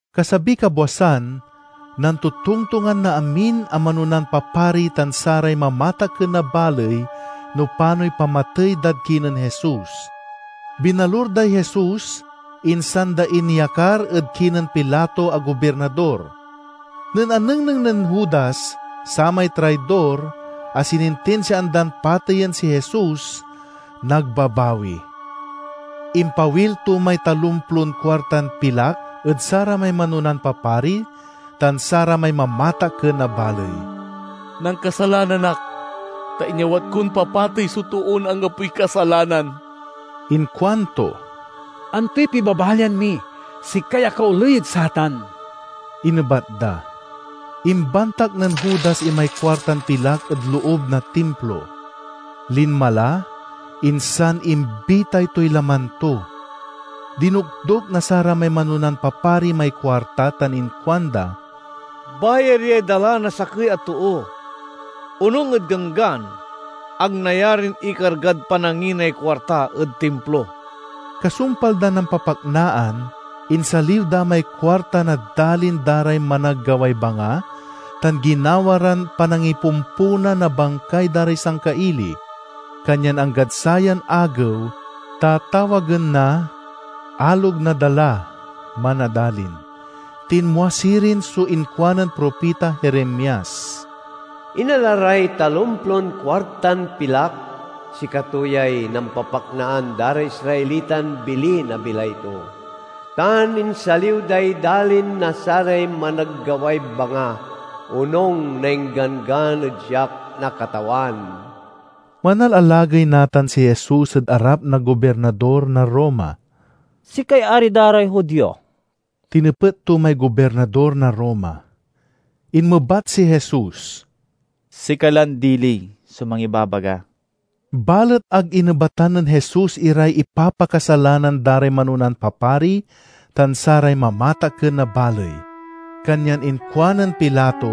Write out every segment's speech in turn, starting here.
Kasabiy kabwasan, nantotongtongan na amin a manonan papari tan saray mamatakken na baley no panoy pamatey dad kinen Jesus. Binalur day Jesus, insan da inyakar ed kinen Pilato a gobirnador. Nen anengneng nen Judas, samay traidor, a sinintinsiaan dan pateyen si Jesus, nagbabawi. Impawil to may talomplon kuartan pilak ed saramay manonan papari tan saramay mamatakken na baley. "Nankasalanan ak, ta inyawat kon papatey so toon anggapoy kasalanan!" inkuanto. "Antoy pibabalian mi? Sikay akaoley ed satan!" inebat da. Imbantak nen Judas imay kuartan pilak ed loob na Timplo. Linma la, insan imbitay toy laman to. Dinokdok na saramay manonan papari may kuarta tan inkuanda, "Bayar yay dala na sakey a too! Onung ed Ganggan, ag nayarin ikargad pananginay kuarta ed Timplo." Kasumpal dan nampapaknaan, insaliw da may kuarta na dalin da ray managgaway banga, tan ginawa ran panangipomponan na bangkay da ray sangkaili. Kanyan anggad sayan agew, tatawagen na "Alog na Dala" man a dalin. Tinmua sirin so inkuanen propita Jeremias, "Inala ray talomplon kuartan pilak (sikato yay nampapaknaan da ray Israelitan bili na bilay to), tan insaliw day dalin na saray managgaway banga, onung na ingganggan ed siak na Katawan." Manalalagey natan si Jesus ed arap na Gobirnador na Roma. "Sikay ari da ray Judio?" tinepet to may Gobirnador na Roma. Inmebat si Jesus, "Sika lan dili so mangibabaga." Balet ag inebatan nen Jesus iray ipapakasalanan da ray manonan papari tan saray mamatakken na baley. Kanyan inkuanen Pilato,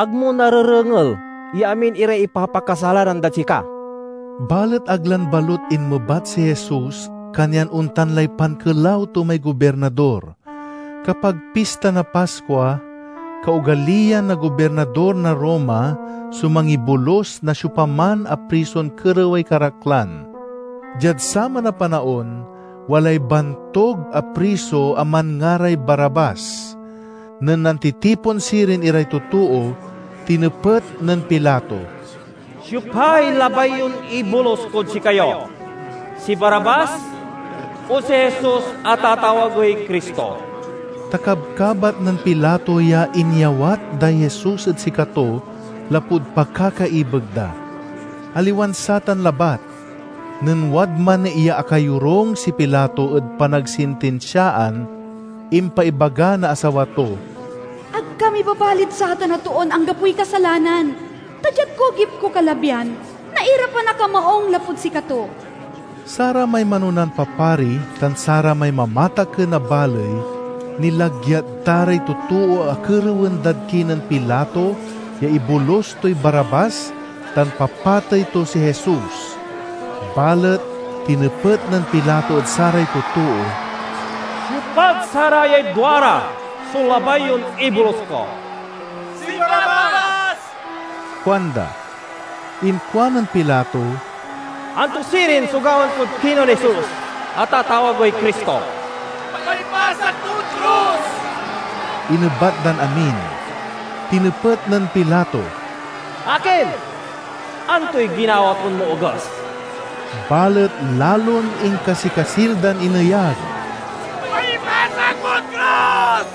"Ag mo narerengel ya amin iray ipapakasalanan dad sika?" Balet ag lan balut inmebat si Jesus, kanyan ontan lay pankelaw to may Gobirnador. Kapag Pista na Paskua, kaogaliyan na gobirnador na Roma so mangibolus na siopaman a prison kerewey karaklan. Diad saman a panaon, walay bantug a priso a manngaray Barabbas. Nen nantitipon sirin iray totoo, tinepet nen Pilato, "Siopay labay yon ibolus kod sikayo, si Barabbas o si Jesus a tatawagey Cristo?" Ta kabkabat nen Pilato ya inyawat day Jesus ed sikato lapud pakakaibeg da. Aliwan satan labat. Nen wadman ya akayorung si Pilato ed panagsintinsiaan, impaibaga na asawa to, "Ag ka mibabalid satan a toon anggapoy kasalanan, ta diad kugip ko kalabyan nairapan ak a maung lapud sikato." Saramay manonan papari tan saramay mamatakken na baley nilagyat da ray totoo a kerewen dad kinen Pilato ya ibolus toy Barabbas tan papatey to si Jesus. Balet tinepet nen Pilato ed saray totoo, "Siopad sarayay duara so labay yon ibolus ko?" "Si Barabbas!" kuanda. Inkuanen Pilato, "Anto sirin so gawaen kod kinen Jesus a tatawagey Cristo?" "Paipasak mod krus!" inebat dan amin. Tinepet nen Pilato, "Akin, antoy ginawa ton maoges?" Balet lalon inkasikasil dan ineyag, "Paipasak mod krus!"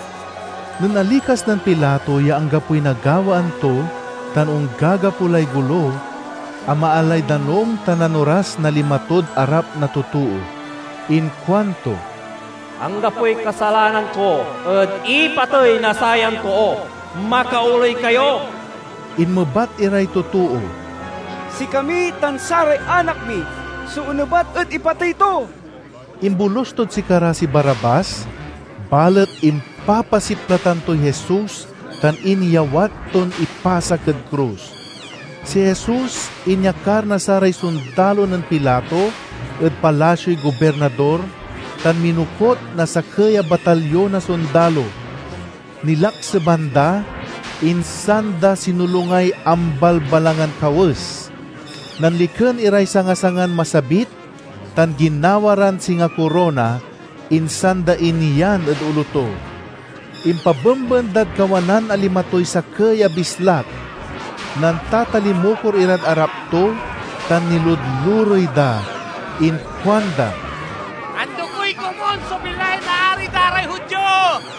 Nen alikas nen Pilato ya anggapoy nagawaan to tan onggagapo lay golo, amaalay danum tan nanoras na lima tod arap na totoo. Inkuanto, "Anggapoy kasalanan ko ed ipatey na sayan too! Makaoley kayo!" Inmebat iray totoo, "Sikami tan saray anak mi so onebat ed ipatey to!" Imbolus tod sikara si Barabbas, balet impapasiplatan toy Jesus tan inyawat ton ipasak ed krus. Si Jesus inyakar na saray sondalo nen Pilato ed palasioy gobirnador, tan minokut na sakey a batalyon na sondalo. Nilakseban da, insan da sinolungay ambalbalangan kawes. Nanliken iray sanga-sangan masabit tan ginawa ran singa korona, insan da inyan ed olo to. Impabemben dad kawanan a lima toy sakey a bislak. Nantatalimukor irad arap to tan niludlurey da. Inkuanda, "Andokey komun so bilay na Ari da ray Judio!"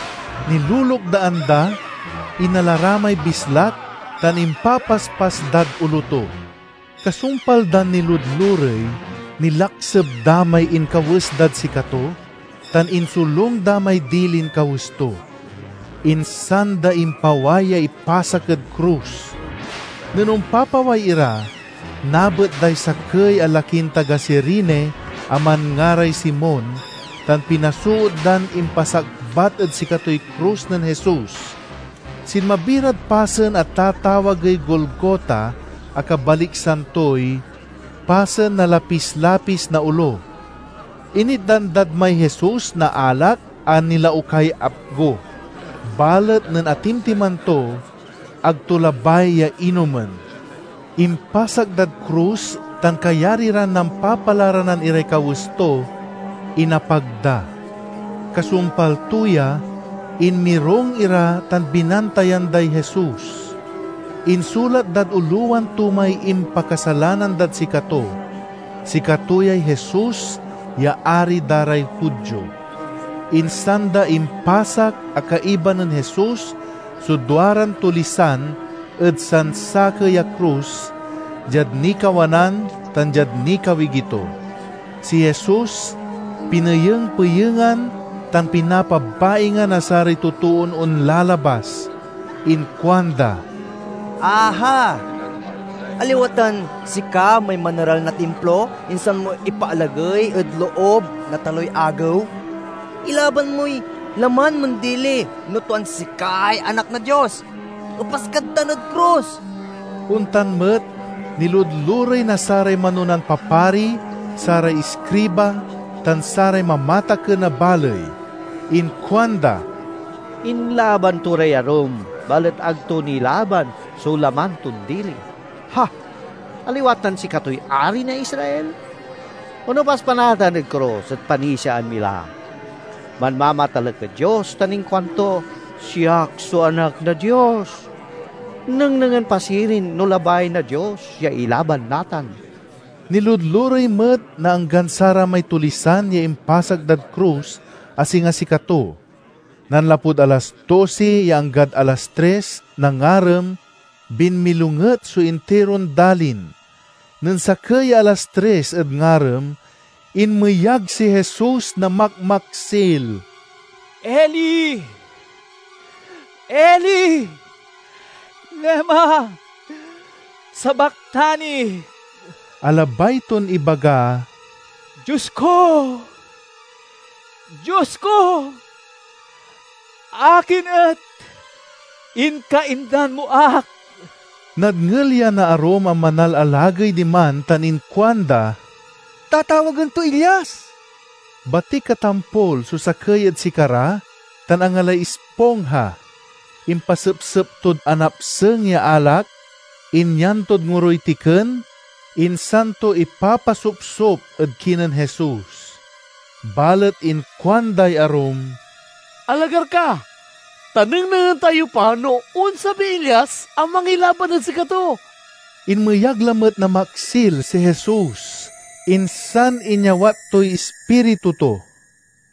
Nilulukdaan da, inala ra may bislak tan impapaspas dad olo to. Kasumpal dan niludlurey, nilakseb da may inkawes dad sikato, tan insolung da may dilin kawes to. Insan da impaway ya ipasak ed krus. Nen ompapaway ira, nabet day sakey a lakin taga Cirene a manngaray Simon, tan pinasoot dan impasakbat ed sikatoy krus nen Jesus. Sinmabi rad pasen a tatawagey Golgota a kabaliksan toy "Pasen na Lapis-lapis na Olo." Initdan dad may Jesus na alak a nilaukay apgo. Balet nen atimtiman to, ag to labay ya inomen. Impasak dad krus tan, kayari ran nampapalaranan iray kawes to, inapag da. Kasumpal to ya, inmirung ira tan binantayan day Jesus. Insulat dad olowan to may impakasalanan dad sikato: "Sikato yay Jesus ya Ari da ray Judio." Insan da impasak a kaiba nen Jesus so duaran tulisan ed sansakey a krus, diad nikawanan tan diad nikawigi to. Si Jesus pineyeng-peyengan tan pinapabaingan na saray totoon onlalabas. Inkuanda, "Aha, aliwa tan sika may maneral na Timplo, insan mo ipaalagey ed loob na taloy agew? Ilaban moy laman mon dili, no tuan sikay Anak na Dios! Epas kad tan ed krus!" Ontan met, niludlurey na saray manonan papari, saray iskriba, tan saray mamatakken na baley. Inkuanda, "Inlaban to ray arum, balet ag to nilaban so laman ton dili! Ha! Aliwa tan sikatoy Ari na Israel? Onepas pa natan ed krus, et panisiaan mi la! Manmamatalek ed Dios tan inkuanto, 'Siak so Anak na Dios!' Nengnengen pa sirin no labay na Dios ya ilaban natan!" Niludlurey met na anggan saramay tulisan ya impasak dad krus, a singa sikato. Nanlapud alas dosi ya anggad alas tris na ngarem, binmilonget so intiron dalin. Nen sakey ya alas tris ed ngarem, inmeyag si Jesus na makmaksil, "Eli, Eli, lema sabachthani?" a labay ton ibaga, "Dios ko, Dios ko, akin et inkaindan mo ak?" Nadngel ya na arum a manalalagey diman tan inkuanda, "Tatawagen toy Elias!" Batik a tampol so sakey ed sikara, tan angalay ispongha. Impasepsep tod anapseng ya alak, inyan tod ngoroy tiken, insan to ipapasopsop ed kinen Jesus. Balet inkuanday arum, "Alagar ka, ta nengnengen tayo pa no onsabiy Elias a mangilaban ed sikato!" Inmeyag lamet na maksil si Jesus, insan inyawat toy ispiritu to.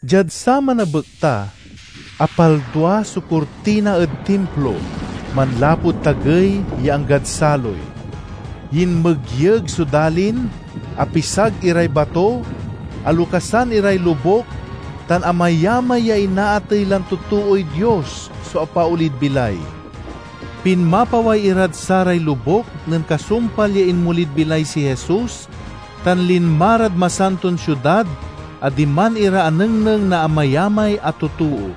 Diad saman a bekta, apaldua so kurtina ed Timplo, manlapud tagey ya anggad saloy. Yinmegyeg so dalin, apisag iray bato, alokasan iray lobuk, tan amayamay ya inaatey lan totooy Dios so apaolid bilay. Pinmapaway irad saray lobuk nen kasumpal ya inmolid bilay si Jesus, tan linma rad Masanton Siudad a diman ira anengneng na amayamay a totoo.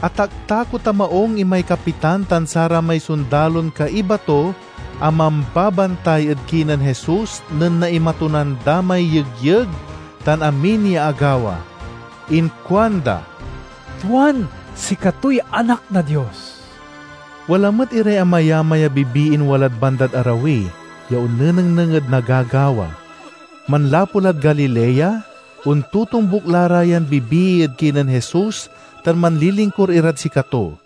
Ataktakot a maung imay kapitan tan saramay sondalon kaiba to a mambabantay ed kinen Jesus nen naimatunan da may yegyeg tan amin ya agawa. Inkuanda, "Tuan sikatoy Anak na Dios!" Wala met iray amayamay a bibiin walad bandad arawi ya onnenengneng ed nagagawa. Manlapu lad Galilea, ontotombuk la ra yan bibii ed kinen Jesus tan manlilingkur irad sikato.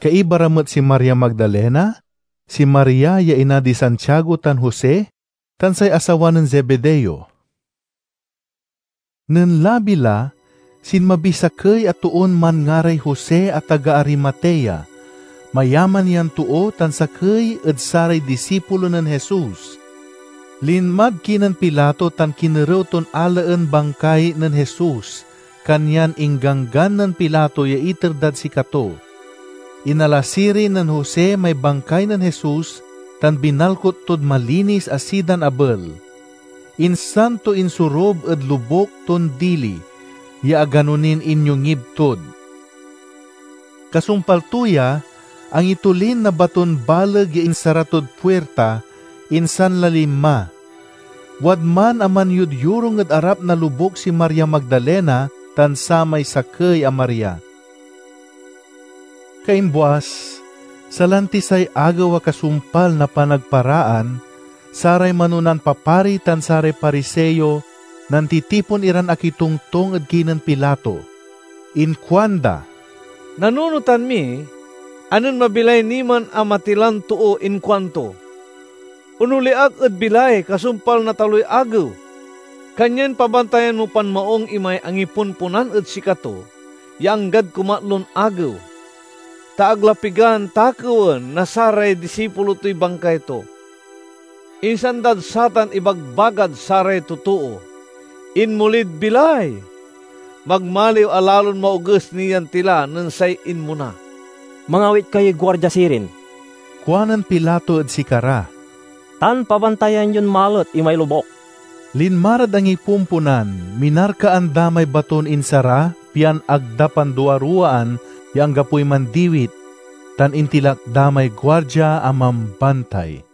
Kaiba ra met si Maria Magdalena, si Maria ya ina di Santiago tan Jose, tan say asawa nen Zebedeo. Nen labi la, sinmabiy sakey a toon manngaray Jose a taga Arimatea. Mayaman yan too tan sakey ed saray disipulo nen Jesus. Linmad kinen Pilato tan kinerew ton alaen bangkay nen Jesus, kanyan ingganggan nen Pilato ya iter dad sikato. Inala sirin nen Jose may bangkay nen Jesus tan binalkut tod malinis a sidan abel, insan to insorub ed lobuk ton dili, ya agano nin inyongib tod. Kasumpal to ya, angitolin na baton baleg ya insara tod puirta, insan la linma. Wadman a manyodyorung ed arap na lobuk si Maria Magdalena tan samay sakey a Maria. Kaimbuas, salantiy say agew a kasumpal na Panagparaan, saray manonan papari tan saray Pariseo nantitipon iran akitongtong ed kinen Pilato. Inkuanda, "Nanunotan mi a nen mabilay ni man a matilan too inkuanto, 'Onoli ak ed bilay kasumpal na taloy agew.' Kanyan pabantayan mo pan maung imay angipomponan ed sikato ya anggad kumatlon agew, ta ag la pigan takewen na saray disipulo toy bangkay to. Insan dad satan ibagbagad saray totoo, 'Inmolid bilay!' Magmaliw a lalon maoges ni yan tila nen say inmona." "Mangawit kayoy guardia sirin," kuanen Pilato ed sikara, "tan pabantayan yon malet imay lobuk." Linma rad angipomponan, minarkaan da may baton insara pian ag da panduaruwaan ya anggapoy mandiwit, tan intilak da may guardia a mambantay.